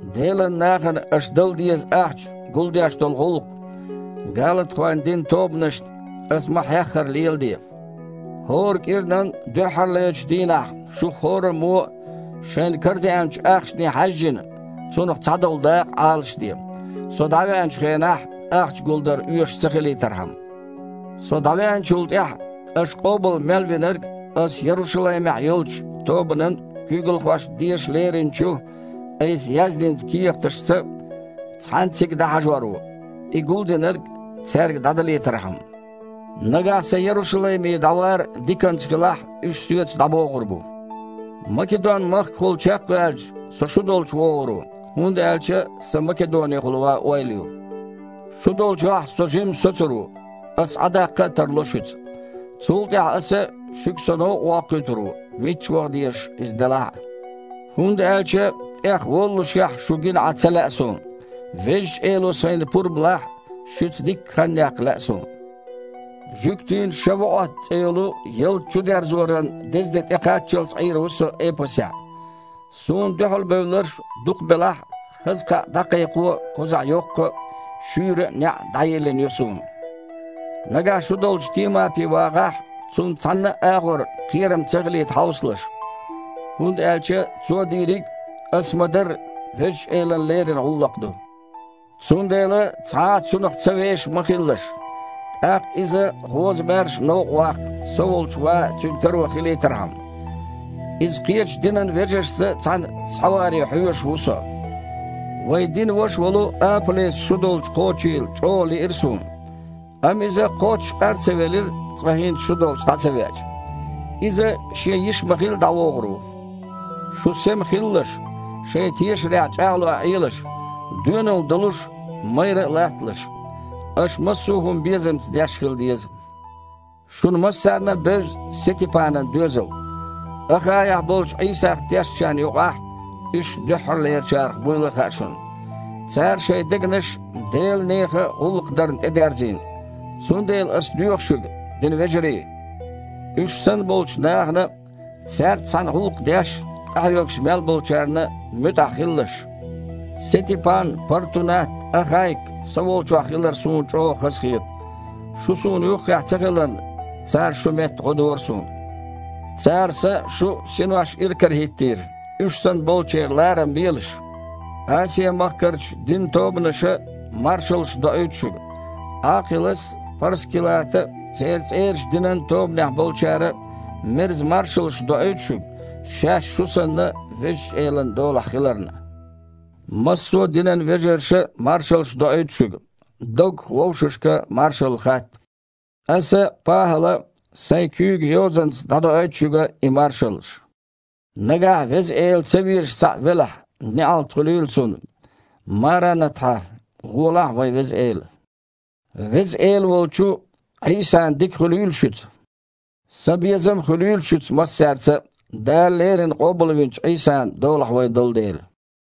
Делан нахана аша дала деза ахча гулдеш долу гІуллакх, галатахойн динан тобанашна аса ма-хьеххара, леладе. ХІора кІиранан дуьххьарлерчу дийнахь шух хІораммо а, шайна карадеанчу ахчане хьаьжжина, цунах цхьадолу дакъа Іалашде, со дІавеанчу хенахь ахча гулдар оьшуш ца хилийтархьама. Со дІавеанчул тІаьхьа, аша къобал мел винарг аса Ярушалаймехь йолчу тобанан куьйгалхошна деша леринчу айса яздинчу кехаташца цхьаьна цига дІахьажор ву, и гулдинарг цаьрга дІадалийтархьама. Нагахь сан Ярушалайме дІавар диканца хилахь, уьш соьца дІабогІур бу. Македон-махкахула чекхваьлча, со шу долчу вогІур ву, хІунда аьлча сан Македонехула ван ойла ю. Шу долчохь со жимма соцур ву, аса Іа даккха а тарло шуьца. Цул тІаьхьа аса шуьга со новкъа воккхуьйтур ву, мичча ваха дезаш иза делахь а. ХІунда аьлча тІехволлушехь шу гина Іа ца лаьа суна. Везачу Эло сайна пурба лахь, шуьца дикка хан яккха лаьа суна. Жуьгтийн «ШавуІот» цІе йолу ялта чудерзоран дезде тІекхаччалц Іийр ву со Эпасехь. Суна дуьхьалбевлларш дукха белахь а, хаза кхаъ дІакхайкхо кхузахь йоккха а, шуьйра а неІ дІайиллина ю суна. Нагахь шу долчу Тимапи вагІахь, цунна цхьанна а агІор кхерам ца хилийта хьовсалаш, хІунда аьлча цо дийриг а, ас ма-дарра, Везачу Элана лерина гІуллакх ду. Цундела цхьа а цунах ца вешаш ма хилалаш. ТІаккха иза гІоза-маьрша новкъа ваккха, со волчу ван цуьнан таро хилийтархьама. Иза кхечу динан вежаршца цхьаьна схьаваре хьоьжуш ву со. Вайн динан ваша волу Апа-Леса шу долчу кхочийла чІогІа лиира суна. Амма иза кхоччуш къар ца велира, цкъа хІинца шу долчу дІа ца веача. Иза, шен йиш ма-хилли, дІавогІур ву. Шу сема хилалаш, шайн тешарехь чІагІлой Іелаш, доьналла долуш а, майрра а латталаш. Аша массо а хІума безамца деш хила деза. Шуна массарна а бевза Сетипанан доьзал. Ахаехь болчу Іийсах тешначарна юкъахь уьш дуьххьарлерачарах буйла а хаьа шуна. Цара шайн дегнаш Делан нехан гІуллакх дарна тІедерзийна. Цундела аса доьху шуьга, динан вежарий, уьш санна болчу нахана а, цаьрца цхьаьна гІуллакх деш а, къахьоьгуш а мел болчарна а муьтІахь хилалаш. Сетипан, Партунат, Ахайк со волчохь хилар суна чІогІа хазахета. Шу суна юххехь ца хиларна, цара, шун метта гІо дора суна. Цара сан а, шун а синош иракарахІиттийра. Уьш санна болчеран ларам белаш. Асиа-махкарчу динан тобанаша маршаллаш доуьйту шуьга. Іакхилас а, ПхьаьрскІилата а, церан цІерачу динан тобанехь болчара а мерза маршаллаш доуьйту шуьга, шаьш, шу санна, Везачу Элан долахь хиларна. Массо а динан вежарша а маршаллаш доуьйту шуьга. Доггах вовшашка маршалла хатта. Аса, ПахІала, сайн куьйган йозанца дІадоуьйту шуьга и маршаллаш. Нагахь Веза Эла ца везаш цхьаъ велахь, неІалт хуьлийла цунна. Марана-тхьа. Волахь, вайн Веза Эла! Веза Эла волчу Іийсан дика хуьлийла шуьца. Сан безам а хуьлийла шуьца массаьрца а, Дала леррина Къобалвинчу Іийсан долахь вай долу дела.